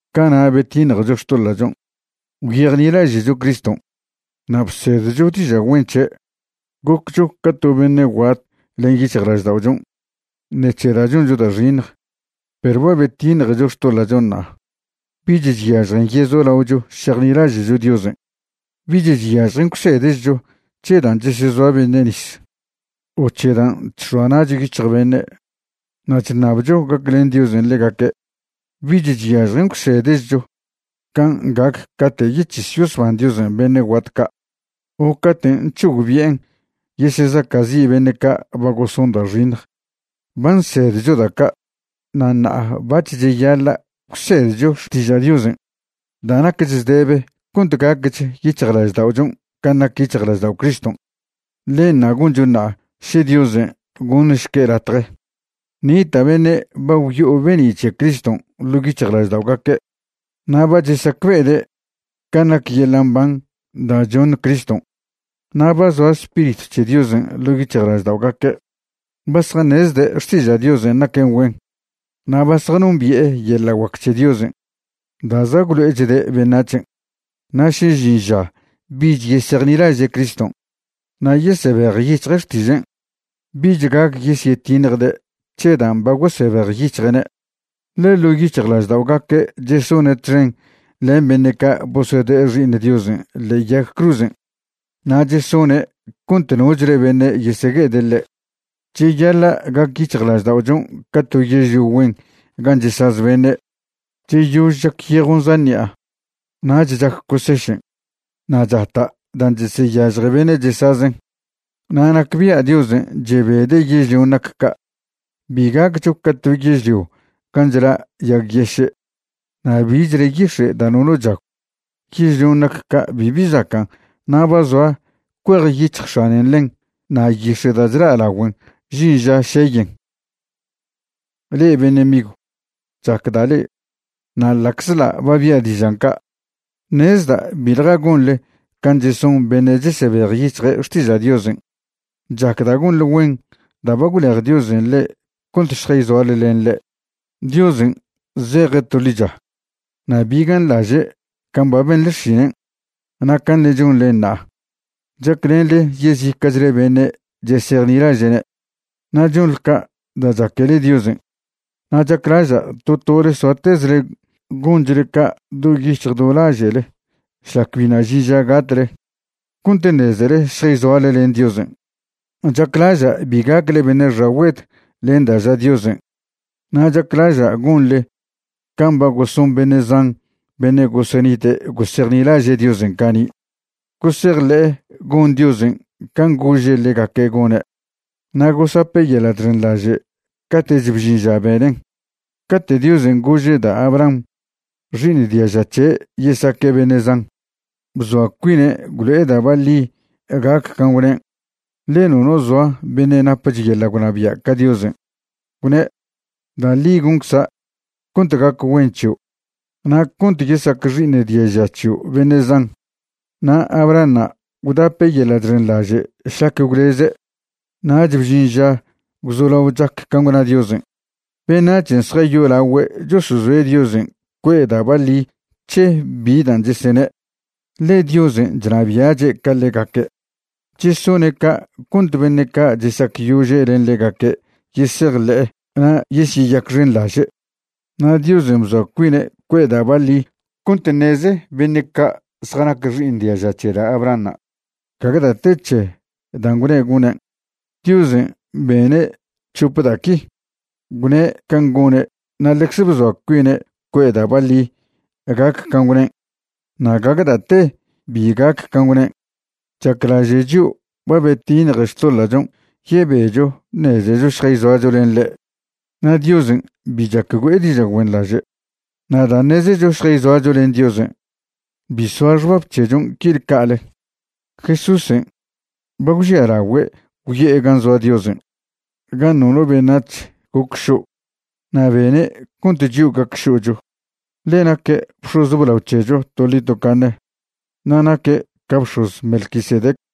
Cana' betiṉjecho xtoḻa'chon', gwyejnilaže'cho Criston', na' bsedcho diža' güen c̱he'. Goccho ca to beṉe' guat len yic̱hjlažda'ochon' ṉec̱he da' choncho da' xiṉj, perw ba betiṉjecho xtoḻa'chon' ṉa'a. Bich chyažjen yezolaocho šejnilaže'cho Diosen'. Bich chyažjen gwsedchcho c̱he dan' chesezoa beṉe' nis o c̱he dan' chx̱oa na'cho yic̱hj beṉe' na' chṉabcho gaclen Diosen' ḻegaque'. Bich chyažjen gwsedchcho can' gac cate' yec̱his yosban Diosen' beṉe' guat ca' o caten' c̱hogbi'en yesezaca'zi' beṉe' ca' ba goson da' xiṉj. Ba nsedcho da' ca', na' ṉa'a bac̱h cheyaḻa' gwsedcho xtiža' Diosen' da' nacch zdebe cont gacch yic̱hjlažda'ochon' can' nac yic̱hjlaždao' Criston'. Ḻenṉa' goncho ṉa'a še Diosen' goṉšque' latje. Nita' beṉe' ba gwyo'o be'ni' c̱he Criston' ḻo' yic̱hjlažda'ogaque', na' ba chesacbe'ede' can' nac yeḻa' mban da' choṉ Criston', na' ba zoa Spiritw c̱he Diosen' ḻo' yic̱hjlažda'ogaque'. Ba zjaṉezde' xtiža' Diosen' naquen güen na' ba zjanombi'e yeḻa' guac c̱he Diosen' da' za' gwlo'echde' beṉac̱hen'. Na' še žin ža bich yesejnilaže' Criston' na' yesebejyic̱hje' xtižen', bich gac yesyetiṉjde' c̱he dan' ba gosebejyic̱hje'ne', ḻe ḻo' yic̱hjlažda'ogaque' chesone' txen len beṉe' ca' bosode'e Xi'iṉ Diosen' ḻe'e yag cruzen', na' chesone' cont nochle beṉe' yesegue'ede' ḻe'. Cheyaḻa' gac yic̱hjlažda'ochon' ca to yežlio güen gan' chesaz beṉe'. Cheyož chac yejon' zan ṉi'a, nach chac cosešen'. Na' chata' dan' cheseyažje beṉe' chesazen'. Na' nacbia' Diosen' chebede' yežlion' nac ca'. Bi gaccho ca to yežlio gan' chla' yag yeše' na' bichle yix̱e' da' nono chagw. Yežlion' nac ca' bibi zacan', na' ba zoa cuejyic̱hj x̱anen ḻen na' yix̱e' da' chla' lagüen žin ža šeyen. Le'e beṉe' migw, chacda' le'e, na' ḻa'czḻa' ba bia' dižan' ca', ṉezda' biḻja gonḻe can' cheson beṉe' chesebejyic̱hje' xtiža' Diosen'. Chacda' gonḻe güen da' ba gwlej Diosen' le'e cont šjayzoale len ḻe'. Diosen' zeje' to ḻicha, na' bi ganḻaže' can' ba benḻe xšinen' na' can' ṉe' chonḻen ṉa'a chaclenḻe yezica'chle beṉe' chesejnilaže'ne'. Na' chonḻe ca' da' chaquele Diosen'. Na' chaclaža' to tole soatezle gonchle ca' do yic̱hj do laže'le šlac biṉa' žin ža gatle, cont ṉezele šjayzoale len Diosen'. Chaclaža' bi gacle beṉe' xagüed len da' ža Diosen'. Na' chaclaža' gonḻe can' ba goson beṉe' zan beṉe' gosenite' gosejnilaže' Diosen' cani', gosejḻe'e gon Diosen' can' gože' ḻegaque' gone', na' gosape' yeḻa' chxenḻaže' cate'ch bžin ža benen'. Cate' Diosen' gože' da' Abraham xi'iṉ diaža c̱he' yesaque' beṉe' zan, bzoa cuine' gwlo'e da' baḻi gac can' gwnen', ḻe nono zoa beṉe' napch yeḻa' gwnabia' ca Diosen'. Gwne': “Da' ḻi goncza' cont gac güen c̱hio' na' cont yesac xi'iṉ diaža c̱hio' beṉe' zan.” Na' Abrahanṉa' gwdape' yeḻa' chxenḻaže' šlac gwleze', nach bžin ža gwzolao chac can' gwna Diosen'. Beṉac̱hen' zjayolagüe' chosozoe' Diosen' cue'e da' baḻi c̱he bi dan' chesene', ḻe Diosen' chnabia'che' ca ḻegaque'. Chesone' ca' cont beṉe' ca' chesacyože' len ḻegaque' yesejḻe'e na' yesyeyacxenḻaže'. Na' Diosen' bzoa cuine' cue'e da' baḻi cont ṉeze beṉe' ca' zjanac xi'iṉ diaža c̱he da' Abrahanṉa' gague da' te c̱he dan' gwne' gonen'. Diosen' bene' c̱hope da' qui: gwne' can' gone' na' ḻecze bzoa cuine' cue'e da' baḻi gac can' gwnen', na' gague da' te bi gac can' gwnen'. Chaclaže' chio' ba betiṉje xtoḻa'chon' yebecho ṉezecho šjayzoacho len ḻe'. Na' Diosen' bi chac güe'e diža' güenḻaže'. Na' da' ṉezecho šjayzoacho len Diosen', bi soa xbab c̱hechon' quile ca'le. Jesúsen' ba gwžialagüe' gwyo'e gan' zoa Diosen' gan' nono beṉac̱h goc šo', na' bene' cont chio' gac šo'cho. Ḻe naque' bx̱oz blao c̱hecho toḻi tocaṉe, na' naque' ca bx̱oz Melquisedec.